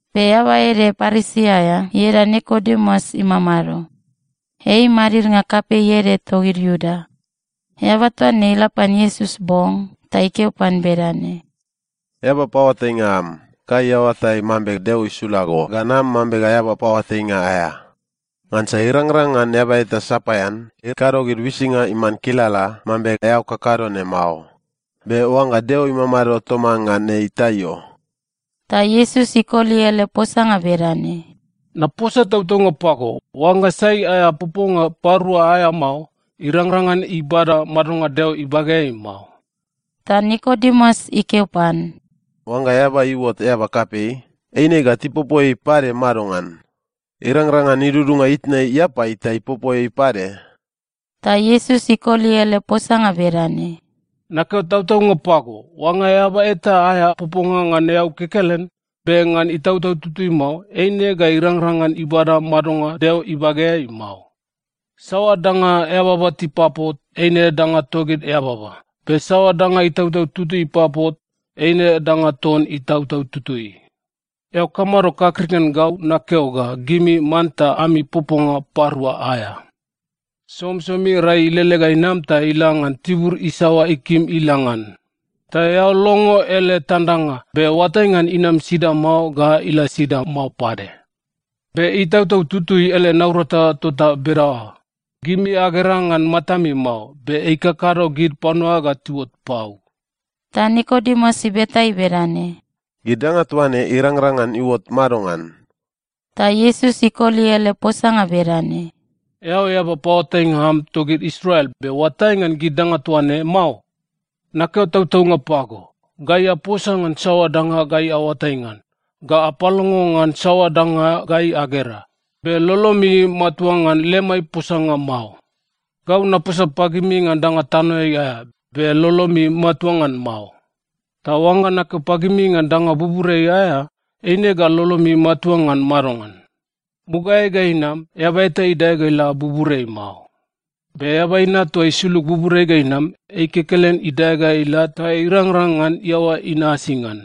Be eaba ede Parisi aea ieda Nikodemus imamado. Ei madidnga kapei ede togid Iuda. Eaba toa ne ila pan Iesus bong ta ikeo pan bedane, “Eaba paoatainga am, gai aoatai mambe Deo isula go ga nam mambe eaba paoatainga aea. Ngansa irangrang ngan eaba eta sapaean ikado gid uisinga iman kilala mambe eao kakado ne mao. Be oangga Deo imamado toman ngan ei, ta io.” Ta Iesus ikoli ele posanga bedane, “Naposa tautaunga pago, oangga sai aea poponga parua aea mao, irangrang ngan ibada madonga Deo ibageai mao.” Ta Nikodemus ikeo pan, “Oangga eaba iuot eaba kapei, eine ga tipopo ei pade madongan? Irangrang ngan idudunga itna iapai, ta ipopo ei pade?” Ta Iesus ikoli ele posanga bedane, “Nakeo tautaunga pago, oangga eaba eta aea poponga ngan eau kekelen, be ngan Itautau Tutui mao, eine ga irangrang ngan ibada madonga Deo ibageai mao. Saoa danga eababa tipapot eine danga togid eababa, be saoa danga Itautau Tutui ipapot, eine danga ton Itautau Tutui. Eao kamado kakrik ngan gau nakeo ga gimi manta ami poponga parua aea? Somisomi rai ilele ga inam ta ila ngan tibur isaoa ikim ila ngan. Ta eao longo ele tandanga, be oatai ngan inam sida mao ga ila sida mao pade. Be Itautau Tutui ele naurata tota bedaoa. Gimi agera ngan matami mao, be ikakado gid panua ga tiuot pau.” Ta Nikodemus ibeta ei bedane, “Gid danga toa ne irangrang ngan iuot madongan?” Ta Iesus ikoli ele posanga bedane, “Eao eaba paoatainga am togid Israel, be oatai ngan gid danga toa ne mao? Nakeo tautaunga pago, gai aposa ngan saoa danga gai aoatai ngan, ga apalongo ngan saoa danga gai agera, be lolomi matua ngan lemai posanga mao. Gau naposa pagimi ngan danga tanoeai aea, be lolomi matua ngan mao. Ta oangga nakeo pagimi ngan danga buburiai aea, eine ga lolomi matua ngan madongan? Mugaeai ga inam, eaba eta idae ga ila buburiai mao. Be Eaba Inat toa isulug buburiai ga inam, ei kekelen idae ga ila ta irangrang ngan iaoa inasi ngan.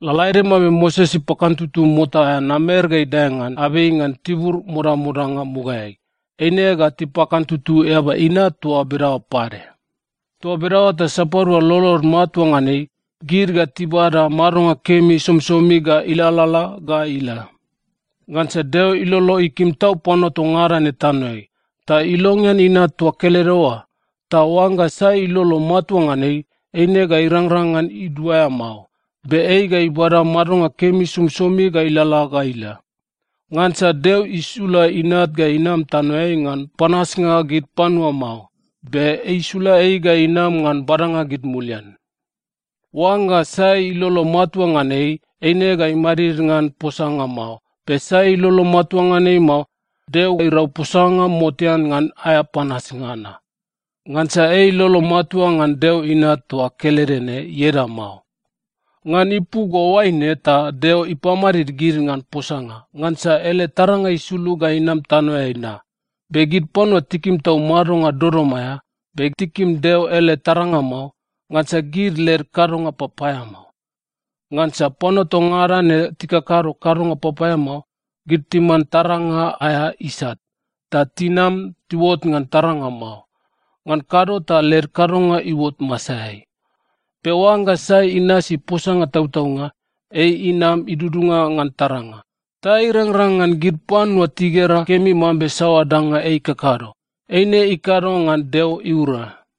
Lalaede mambe Moses ipakantutu mota aea namer ga idae ngan abei ngan tibur modamodanga mugaeai, eine ga tipakantutu Eaba Inat toa bedaoa pade. Toa bedaoa ta sapadua lolod matua ngan ei, gid ga tibada madonga kemi somisomi ga ilalala ga ila. “Ngansa Deo ilolo ikim tau panua toa ngada ne tanoeai, ta ilongean Inat toa kelede oa, ta oangga sai ilolo matua ngan ei, eine ga irangrang ngan iduaea mao. Be ei ga ibada madonga kemi somisomi ga ilalala ga ila. Ngansa Deo isula Inat ga inam tanoeai ngan panasnga gid panua mao. Be isula ei ga inam ngan badanga gid mulian. Oangga sai ilolo matua ngan ei, eine ga imadid ngan posanga mao. Be sai ilolo matua ngan ei mao, Deo irau posanga motean ngan aea panasnga na. Ngansa ei ilolo matua ngan Deo Inat toa kelede ne ieda mao. Ngan ipu ga oaine ta Deo ipamadid gid ngan posanga. Ngansa ele taranga isulug ga inam tanoeai na, be gid panua tikim tau madonga dodom aea. Be tikim Deo ele taranga mao, ngansa gid led kadonga papaeamao. Ngansa panua toa ngada ne tikakado kadonga papaeamao, gid timan taranga aea isat, ta tinam tiuot ngan taranga mao. Ngan kado ta led kadonga iuot masaeai. Be oangga sai inasi posanga tautaunga, ei inam idudunga ngan taranga, ta irangrang ngan gid panua tigera kemi mambe saoa danga ei ikakado, eine ikado ngan Deo iura.”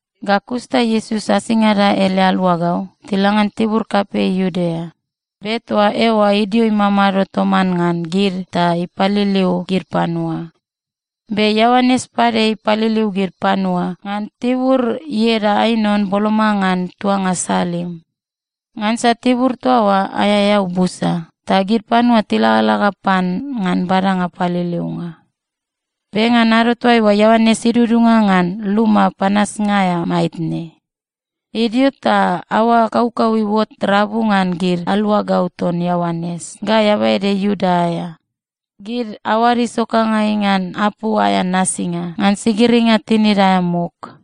Ga kus ta Iesus asingada ele aluagau tila ngan tibur kapei Iudea. Be toa eoa idio imamado toman ngan gid ta ipaliliu gid panua. Be Ioanes pade ipaliliu gid panua ngan tibur ieda Ainon boloma ngan tuanga Salim. Ngansa tibur toa oa aea eau busa, ta gid panua tilagalaga pan ngan badanga paliliunga. Be ngan ado toaiua, Ioanes idudunga ngan luma panasnga aea maitne. Idio ta aoa kaukau iuot rabu ngan gid aluagau ton Ioanes ga eaba ede Iuda aea. Gid aoad isokangai ngan apu aea nasinga ngan sigiringa tinid aea muk.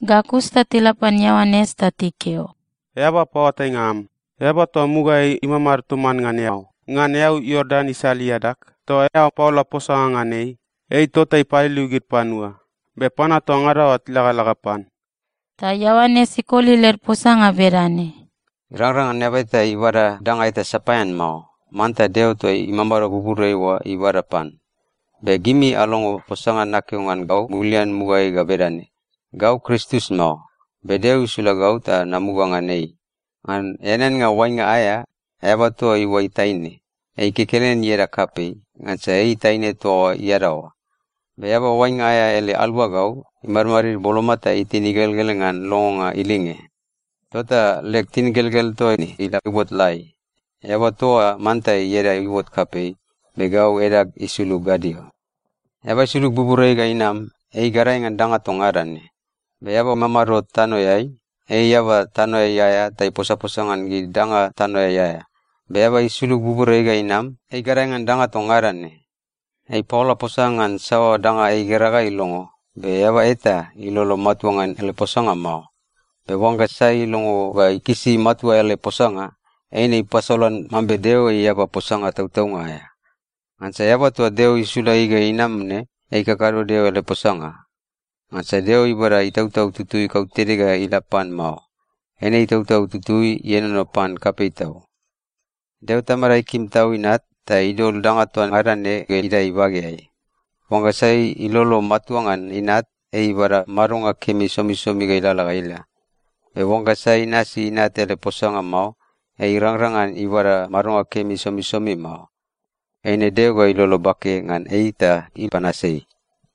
Ga kus ta tila pan Ioanes ta tikeo, “Eaba paoatainga am, eaba toa mugaeai imamado toman ngan eao ngan eau Iordan isal iadag toa eao paola posanga ngan ei, ei tota ipaliliu gid panua, be panua toa ngada oa tilagalaga pan.” Ta Ioanes ikoli led posanga bedane, “Irangrang ngan eaba ibada danga eta sapaean mao. Manta Deo toa imamado buburiai oa ibada pan. Be gimi alongo posanga nakeo ngan gau mulian mugaeai ga bedane, ‘Gau Kristus mao. Be Deo isula gau ta namuga ngan ei.’ Ngan eaneannga oainga aea, eaba toa iuai taine, ei kekelen ieda kapei, ngansa ei taine toa oa iadaoa. Be eaba oainga aea ele aluagau imadmadid boloma ta itin igelgel ngan longonga ilinge. Tota leg tingelgel toa ne ila iuot lai. Eaba toa oa manta ieda iuot kapei, be gau edag isulug gadio. “Eaba isulug buburiai ga inam, ei gadae ngan danga toa ngada ne. Be eaba imamado tanoeai, ei eaba tanoeai aea ta iposaposa ngan gid danga tanoeai aea. Be eaba isulug buburiai ga inam, ei gadae ngan danga toa ngada ne. Ei ipaola posanga ngan saoa danga igera ga ilongo, be eaba eta ilolo matua ngan ele posanga mao. Be oangga sai ilongo ga ikisi matua ele posanga, eine ipasolan mambe Deo ei eaba posanga tautaunga aea. Ngansa eaba toa Deo isula ei ga inam ne, ei ikakado Deo ele posanga. Ngansa Deo ibada Itautau Tutui kautede ga ila pan mao. Eine Itautau Tutui ienono pan kapei tau. Deo Tamada ikim tau Inat, ta idol danga toa ngada ne ga idae ibageai. Oangga sai ilolo matua ngan Inat, ei ibada madonga kemi somisomi ga ilalala ga ila. Be oangga sai inasi Inat ele posanga mao, ei irangrang ngan ibada madonga kemi somisomi mao. Eine Deo ga ilolo bake ngan ei ta ipanas ei.”